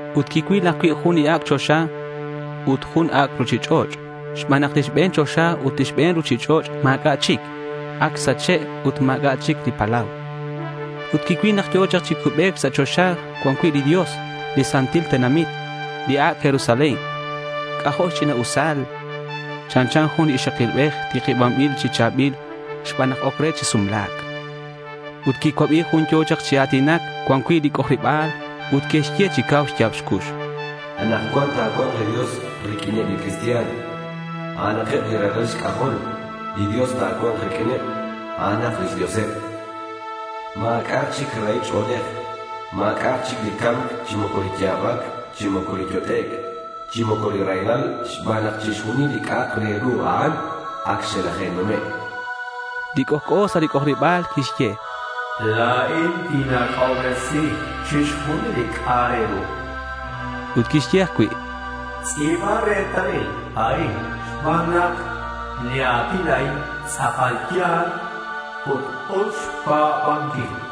Ut quicuil ajcui' jun ac' choxa ut jun ac' ruchich'och' xban nak li xbe̱n choxa ut li xbe̱n ruchich'och' ma̱c'a' chic. Ac xsache'. Ut ma̱c'a' chic li palau. Ut quicuil nak yo̱ chak chi cubec sa' choxa cuan cui' li Dios li santil tenamit, li Ac' Jerusalén. C'ajo' xch'ina'usal. Chanchan jun li ixakilbej tikibanbil chi cha̱bil xban nak oc re chi sumla̱c. Ut quicuabi jun yo̱ chak chi a̱tinac cuan cui' li c'ojariba̱l ut quixye chi cau xya̱b xcux: —Anakcuan ta̱cua̱nk li Dios riq'uineb li cristian. A'anakeb li ralal xc'ajol. Li Dios ta̱cua̱nk riq'uineb. A'anak lix Dioseb. Ma̱c'a'ak chic rahil ch'o̱lej. Ma̱c'a'ak chic li ca̱mc chi moco li ya̱bac chi moco li yot'ec', chi moco li raylal xban nak chixjunil li c'a'ak re ru a'an, ac xelaje'nume'.— Li c'ojc'o sa' li c'ojariba̱l quixye: —La̱in tinac'obresi chixjunil li c'a'ak re ru. Ut quixye ajcui': —Tz'i̱ba retalil a'in xban nak li a̱tin a'in tz'akal ya̱l ut us xpa̱banquil.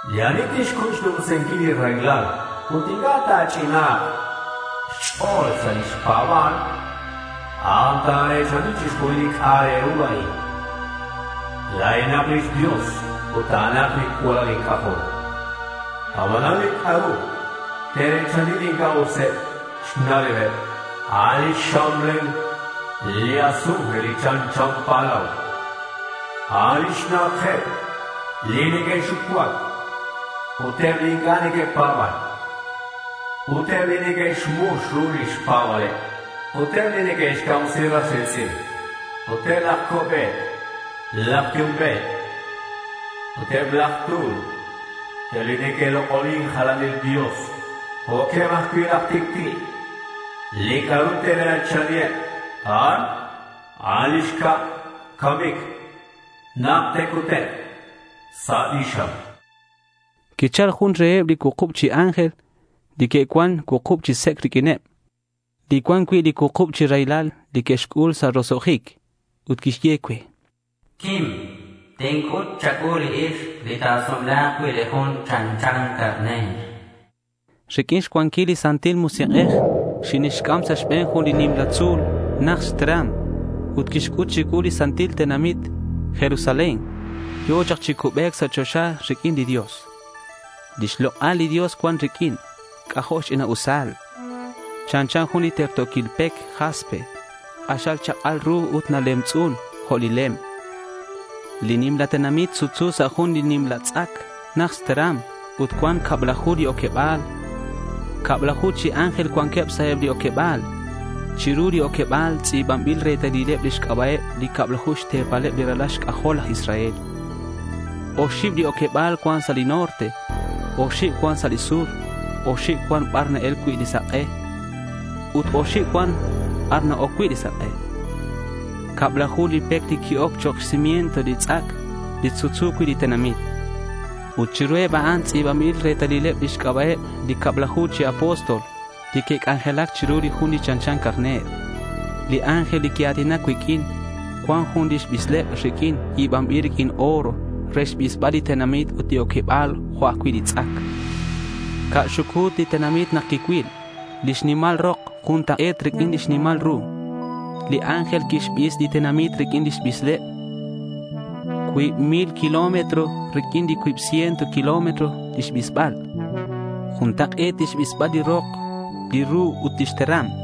Li ani tixcuy xnumsinquil li raylal ut inc'a' ta̱ch'ina̱nk xch'o̱l sa' lix pa̱ba̱l, a'an ta̱re̱chani chixjunil li c'a'ak re ru a'in. La̱inak lix Dios ut a'anak li cualal inc'ajol. Abanan li c'a'ru te're̱chani li inc'a' useb xna'leb, a'an li xxamlel li azufre li chanchan palau, a'an lix na'ajeb li neque'xucuac, ut eb li inc'a' neque'pa̱ban, ut eb li que'xmux ru lix pa̱ba̱leb, ut eb li neque'xcamsi ras ri̱tz'in, ut eb laj co'be̱t laj yumbe̱t, ut eb laj tu̱l, ut eb li neque'lok'onin jalanil dios, jo'queb ajcui' laj tic'ti'. Li c'a'ru te're̱chani eb a'an, a'an li xcab camic nak te'cutek' sa' li xam.— Quichal jun reheb li cuukub chi ángel li que'cuan li cuukub chi sec' riq'uineb, li cuan cui' li cuukub chi raylal li que'xc'ul sa' roso'jic, ut quixye cue: —Quim. Tinc'ut cha̱cuu li ixk li ta̱sumla̱k cui' li Jun li chanchan carner, chan. Riq'uin xcuanquil li Santil Musik'ej, xinixc'am sa' xbe̱n jun li nimla tzu̱l najt xteram ut quixc'ut chicuu li santil tenamit Jerusalén, yo̱ chak chi cubec sa' choxa riq'uin li Dios. Lix lok'al li Dios cuan riq'uin. C'ajo' xch'ina'usal. Chanchan jun li terto̱quil pec jaspe. K'axal xchak'al ru ut nalemtz'un jo' li lem. Li tenamit sutsu sa' jun nimla tz'ac najt xteram ut cuan cablaju li oqueba̱l. Cablaju chi ángel cuanqueb sa' eb li oqueba̱l. Chiru li oqueba̱l tz'i̱banbil retalileb li xc'aba'eb li cablaju xte̱paleb li ralal xc'ajol laj Israel. Oxib li oqueba̱l cuan sa' li norte, oxib cuan sa' li sur, oxib cuan bar na-el cui' li sak'e ut oxib cuan bar na-oc cui' li sak'e. Cablaju li pec li qui-oc chok' xcimiento li tz'ac li sutsu cui' li tenamit. Ut chiruheb a'an tz'i̱banbil retalileb lix c'aba'eb li cablaju chi apóstol li que'c'anjelac chiru li Jun li chanchan carner. Li ángel li quia̱tinac cuiq'uin cuan jun lix bisleb riq'uin yi̱banbil riq'uin oro re xbisbal li tenamit ut li oqueba̱l jo' ajcui' li tz'ac. Ca̱ xucu̱t li tenamit nak quicuil. Lix nimal rok juntak'e̱t riq'uin xnimal ru. Li ángel quixbis li tenamit riq'uin lix bisleb. Cuib mil kilómetro riq'uin cuib ciento kilómetro lix bisbal. Juntak'e̱t xbisbal li rok, li ru ut lix teram.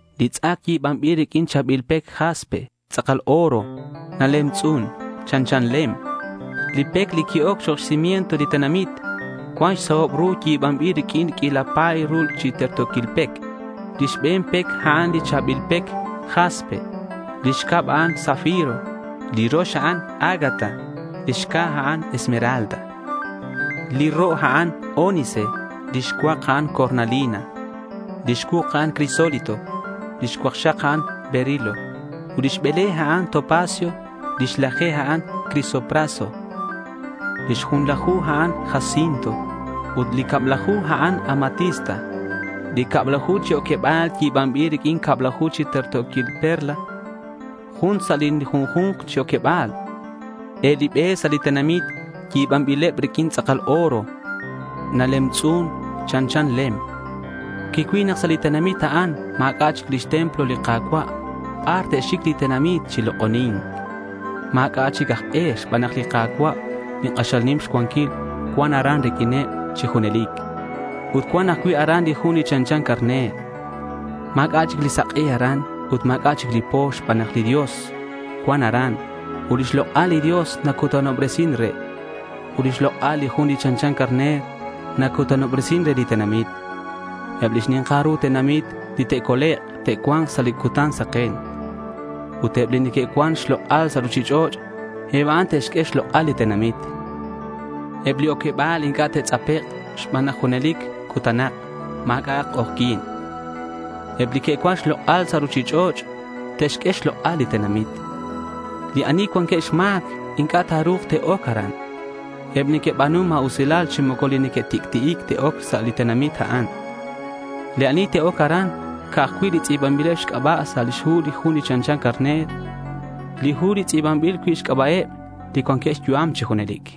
Li tz'ac yi̱banbil riq'uin li cha̱bil pec jaspe. Li tenamit yi̱banbil riq'uin tz'akal oro. Nalemtz'un. Chanchan lem. Li pec li qui-oc chok' xcimiento li tenamit cuan xsahob ru yi̱banbil riq'uin q'uila pa̱y ru chi terto̱quil pec. Li xbe̱n pec, a'an li cha̱bil pec jaspe; lix cab, a'an zafiro; li rox, a'an ágata; li xca̱, a'an esmeralda. Li ro', a'an ónice; li xcuak, a'an cornalina; li xcuuk, a'an crisólito; li xcuakxak, a'an berilo; ut li xbele, a'an topacio; li xlaje, a'an crisopraso; li xjunlaju, a'an jacinto; ut li xcablaju, a'an amatista. Li cablaju chi oqueba̱l, yi̱banbileb riq'uin cablaju chi terto̱quil perla, jun sa' li junju̱nk chi oqueba̱l. Eb li be sa' li tenamit yi̱banbileb riq'uin tz'akal oro. Nalemtz'un. Chanchan lem. Quicuil nak sa' li tenamit a'an ma̱c'a' lix templo li Ka̱cua' bar te'xic li tenamit chi lok'oni̱nc. Ma̱c'a' chic aj e xban nak li Ka̱cua' li k'axal nim xcuanquil cuan aran riq'uineb chi junelic. Ut cuan ajcui' aran li Jun li chanchan carner. Ma̱c'a' li sak'e aran ut ma̱c'a' li po xban nak li Dios cuan aran ut lix lok'al li Dios nacutanobresin re. Ut lix lok'al li Jun li chanchan carner nacutanobresin re li tenamit. Eb li xni̱nkal ru tenamit li te'colek', te'cua̱nk sa' cutan saken. Ut eb li que'cuan xlok'al sa' ruchich'och', eb a'an te'xq'ue xlok'al li tenamit. Eb li oqueba̱l inc'a' te'tz'apek' xban nak junelic cutanak. Ma̱c'a'ak k'ojyi̱n. Eb li que'cuan xlok'al sa' ruchich'och' te'xq'ue xlok'al li tenamit. Li ani cuanqueb xma̱c inc'a' ta̱ru̱k te'oc aran. Eb li neque'xba̱nu ma̱usilal chi moco li neque'tic'ti'ic, te'oc sa' li tenamit a'an. Li ani te'oc aran, ca'aj cui' li tz'i̱banbileb xc'aba' sa' lix hu li Jun li chanchan carner, li hu li tz'i̱banbil cui' xc'aba'eb li cuanqueb xyu'am chi junelic.